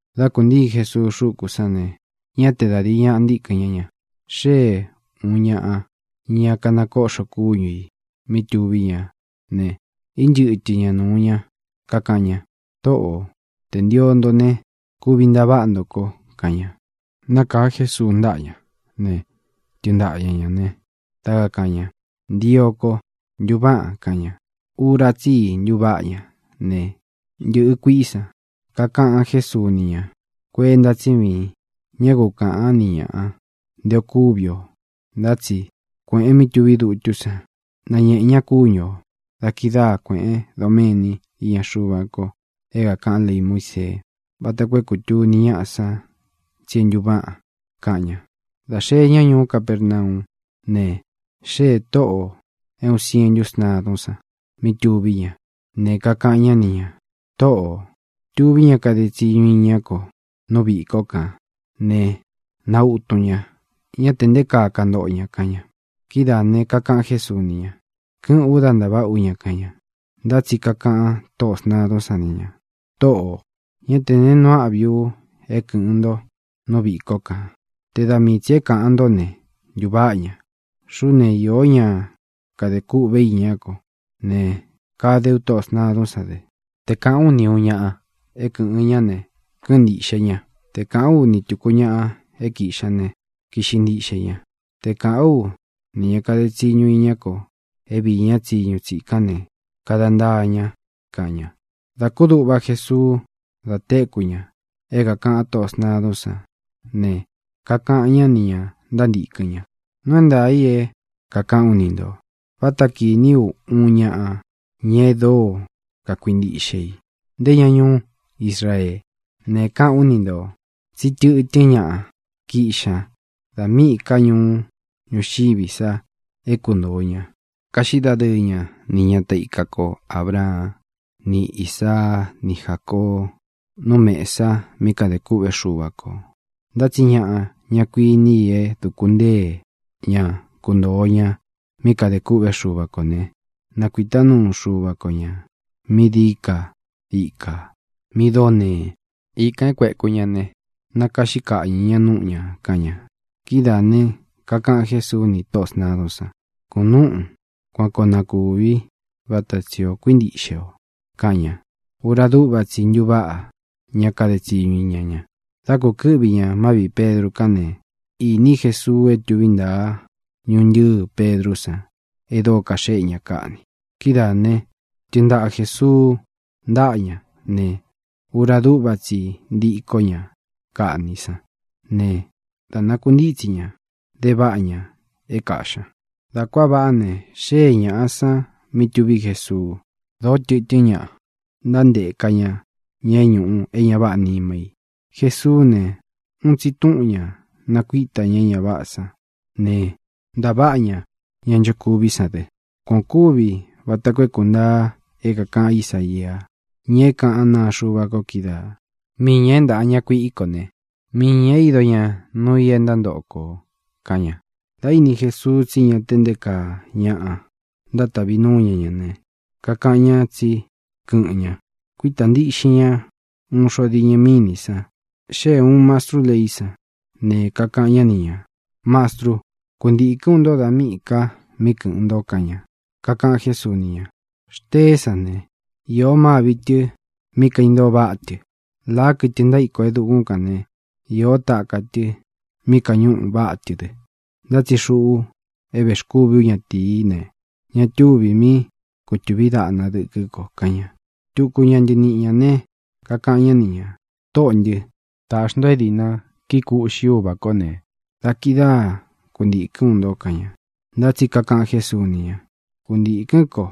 Dá kūntíi Jesuu xúku san ne, ñá te da dīi ñaꞌa intíkɨn ñá ña. Xée ūun ñaꞌa, ña kanakóꞌxo kúñu ī, mí tuví ña ne, ínchɨtɨ ña nūu ñá, kakaꞌan ña: —Tōꞌó, tē ntio nto ne, kuvi ntaváꞌa nto ko —kaꞌan ña. Nákāa Jesuu ntaꞌa ñá ne, tɨɨn ntaꞌa ña ñā ne, dá kakāꞌan ña: —Ntio ko. ¡Ntuváꞌan! —kaꞌan ña. Ura tsí i ntuváꞌa ña ne, ntɨ̄ꞌɨ kuiꞌí san. Kakaꞌan Jésuu ni ña: —Kuenta tsí viin. Ñá ku kāꞌan ni ñaꞌa nté o kuvi o, ntá tsi kuēꞌen mí tuví dutú san, nañēꞌen ña kúñu ō. Da kidáa kuēꞌén doméni iña Xuva ko é kākaꞌan lei Muísee, vata koo é kūtuni ñáꞌa san tsi é ntuváꞌan —kaꞌan ña. Dā xee ñá ñuú Capernaú ne, xéē tóꞌō é uun sientu sntadún san mí tuví ña ne, kakaꞌan ñá ni ñā: —Tōꞌó, tuví ña kade tsiñu iñá ko nú viꞌī kó kān ne, nautun ña. Ñá tē nté kaa kantoꞌo ña —kaꞌan ña. Kidáā ne, kakaꞌan Jésuu ni ña: —Kɨ́ꞌɨ̄n u, dá ntaváꞌā ú ña —kaꞌan ña. Ntá tsi kakaꞌan tóꞌō sntadún san ni ñā: —Tōꞌó, ñá tē neé nuu áꞌvī u é kɨ̄ꞌɨn nto nú viꞌī kó kān. Te da mii tsī é kaꞌan ntó ne, ntuváꞌa ña. Xuꞌú ne, īó ña kade kúꞌve iña kó ne, kade ú tóꞌō sntadún san dɨ. Te kāꞌán u ni ūun ñaꞌa é na kɨ̄ꞌɨn ñá ne, kɨ́ꞌɨn ntīꞌxe ña. Te kāꞌán u ni tūku ñaꞌa é kīꞌxi ña ne, kiꞌxi ntiꞌxe ña. Te kāꞌán u nī ña kade tsiñu iñá ko é viī ñá tsiñu tsikán ne, kada ntaa ña —kaꞌan ña. Da kúduꞌva Jesuú da téku ña é kākaꞌan tóꞌō sntadún san ne, kakaꞌan ñá nī ña ntántīkɨn ña: —Nuu é ntaā i é kākaꞌán u ni ntō. Váta kīní u uun ñaꞌa, ña e dóo kakuintíꞌxe i, nté ña ñuú Israee. Ne, kaꞌán u ni ntō tsí tɨ̄tɨ́n ñaꞌa kiꞌxi ña da míꞌī ká ñuú ñuxiví san é kuntoo ña, kaꞌxí dadɨɨ ña ni ñata ika ko Ābraan ni Ísaa ni Jácoo nú mēsa mí kadē kûꞌvé Xuva kō. Ntá tsi ñaꞌa, ñá kuini i é duku ntée ña kuntōo ña mí kadē kûꞌvé Xuva kō ne, nakuītá nuu Xuva ko ñā mí dií ka ikā, mí dóo nee. Ikān e kueku ña ne, nakaꞌxí kaꞌñɨ̄ ña núꞌu ñā —kaꞌan ña. Kidáā ne, kakaꞌan Jésuu ni tóꞌō sntadún san: —Kunúꞌun. Kuan koo na kūví vata tsī o kuíntiꞌxe o —kaꞌan ña. Ura dúꞌva tsi i ntuváꞌa ña kade tsiñu iña ña. Dá kūkɨ́ꞌvi ña má viꞌī Pedru kán ne, īní Jesuu é tuví ntaa ñuntɨ́ɨ Pedrú san e dóo kaxéꞌe ña kaꞌni. Kidáā né, tɨɨn ntaꞌa Jēsuu ntáꞌa ña ne, ura dúꞌva tsi i ntikó ña kaꞌni sán ne, dā nakuntítsi ña, de váꞌa ña é kāꞌxi ña. Dā kuáa vaꞌá ne, xée ñāꞌa san mí tuví Jesuu. Dōó tɨtɨ́n ñaꞌa ntánteka ña ña é ñūꞌu é ña váꞌā nima i. Jesuú ne, uun tsi túꞌun ñā nakuíta ña é ña váꞌā san ne, ntāváꞌa ña ña nchokuví san dɨ. Kuan ō kúvī vata koo é kūntaa é kākaꞌan Ísaia, ña é kaꞌán naa Xuva ko kídaā: “Mii ñā é ntāꞌa ña kuiꞌi ko ne, mii ñā ído ñā nuu i é ntántoꞌo kō”, kaꞌan ña. Dā íni Jesuu tsí ña te nté kaa ñaꞌa ntátavi núu ña ña ne, kakaꞌan ña tsí kɨꞌɨn ña, kuita ntiꞌxin ña uun xo diñɨ mínī san. Xée ūun mastrú leí san, ne, kakaꞌan ñá ni ñā: —Mastrú, kuntīkɨ́n u nto dā míꞌī ka mí kɨ̄ꞌɨn nto —kaꞌan ña. Kakaꞌan Jésuu ni ña: —Xteé san ne, īó mâvi tɨ mí kaintoo váꞌa tɨ. Lāá, kɨtɨ ntaíko e dukún kān né, īó taka tɨ mí kañuꞌu váꞌa tɨ dɨ. Ntá tsi xuꞌú é vēxkúvī ú ñatīí ne, ña túvī mí kutūví daꞌna dɨkɨ́ ko —kaꞌan ña. Tuku ña ntɨniꞌi ñā né, kakaꞌan ñá ni ñā: —Tōꞌó ntɨ, taꞌxi nto é diꞌna kikuꞌxí u uvā kó ne, da kidáa kuntīkɨ́n u nto —kaꞌan ña. Ntá tsi kakaꞌan Jésuu ni ña: —Kuntīkɨ́n ko.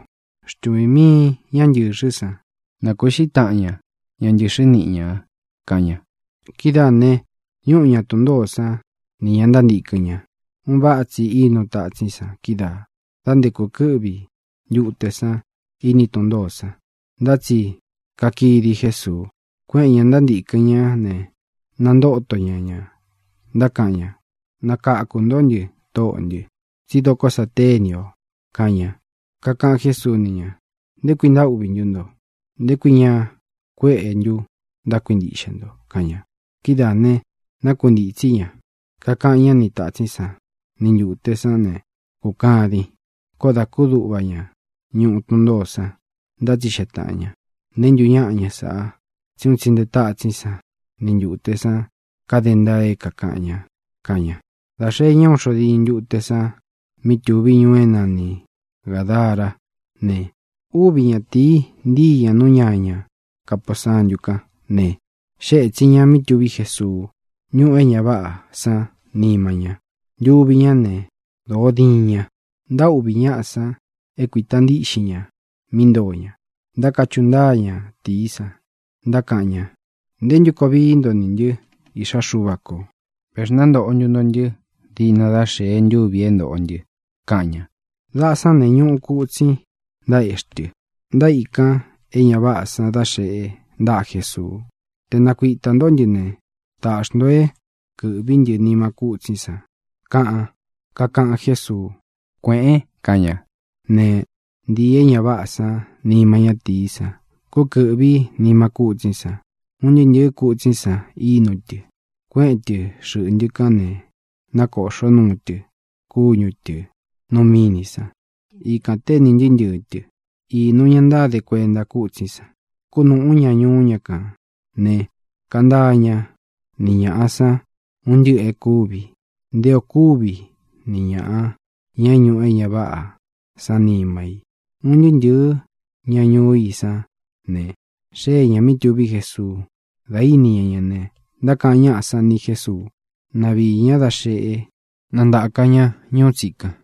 Xtuvīn miin ñá ntɨ̄xɨ́ san, na kūꞌxí taꞌan ña ña ntɨ̄xɨ́ niꞌi ñā —kaꞌan ña. Kidáā ne, ñúꞌu ña tun ntōó san nī ña ntántīkɨn ña. Un váꞌa tsi ínu tatsín san kídaa, dā nté kūkɨ́ꞌvi ntute san iní tun ntōó san. Ntá tsi kakidi Jésuu. Kuéꞌēn ña ntántīkɨn ñá ne, nantóto ña ñā, ntákaꞌan ña: —¡Nakakū ntó ntɨ, Tóꞌō ntɨ, tsí doko sa téni ō! —kaꞌan ña. Kakaꞌan Jésuu ni ña: —¿Nté kui ntaúꞌvī ntú nto? ¿Nté kui ña kueꞌe ntu ntákuintiꞌxe nto? —kaꞌan ña. Kidáā ne, nákuntītsí ña, kakaꞌan ñá ni tātsín san ni ntūte sán ne, kūkadin. Koó dā kúduꞌva ña ñuꞌu tun ntōó san, ntátsixeꞌe tāꞌan ña: —¿Neé ntu ñaꞌa ña sāꞌa? Tsí un tsi nte tátsín san ni ntūte san kade ntaa é kākaꞌan ña —kaꞌan ña. Dā xee ñá uun xo diñɨ ntute san mí tuví ñuu é nani Gādará ne, úvi ñatīi ntíi ña nú ñaña kapūsantu kán ne, xée ētsin ña mí tuví Jesuu. Ñúꞌū é ña váꞌā san nima ñá ntuvi ñá ne, dōo diin ña. Ntaûꞌví ñaꞌa san é kuīta ntíꞌxin ña mí ntoo ña. Ntákachuꞌu ntáa ñatīí san, ntákaꞌan ña: —¿Ntē ntú koo vií nto nī ntɨ́, Iꞌxá Xuva kō? ¿Vēxnántoꞌo ntu nto ntɨ́ diꞌna dá xēe ntúvi ī é ntōꞌo ntɨ? —kaꞌan ña. Daꞌa sán ne, ñuꞌu kutsin, ntaéꞌxi tɨ. Ntaíkan é ña váꞌā san da xeꞌe ntaꞌa Jésuu: —Te nakuitā ntó ntɨ ne, taꞌxī nto é kɨ̄ꞌví ntɨ nima kútsín san —kaꞌan. Kakaꞌan Jésuu: —Kuēꞌen —kaꞌan ña. Ne, ntīi é ña váꞌā san nima ñátīí san, kúkɨ̄ꞌví nima kútsín san. Un ntɨɨ́ ntɨ̄ɨ́ kutsín san ínu tɨ, kueꞌen tɨ́ xɨꞌntɨ kán, ne, nákōꞌxó nuu tɨ kúñu tɨ̄ nu mínī san. Ikān ténī ntɨɨ́ ntɨɨ̄ tɨ. Īnu ña ntáde kuenta kútsín san, kunúꞌu ñā ñuú ña kān ne, kaꞌan ntáa ñá ni ñāꞌa san un ntɨꞌɨ̄ e kúvi, nté ō kúvi ni ñāꞌa, ña é ñūꞌu é ña váꞌā san nima i. Un ntɨɨ́ ntɨ̄ɨ́ ña ñuú i sán ne, xée ñā mí tuví Jesuu. Dā íni ña ña ne, ntákaꞌan ñáꞌa san ni Jésuu, na viī ñá da xeꞌe, na ntāka ña ñuú tsikan.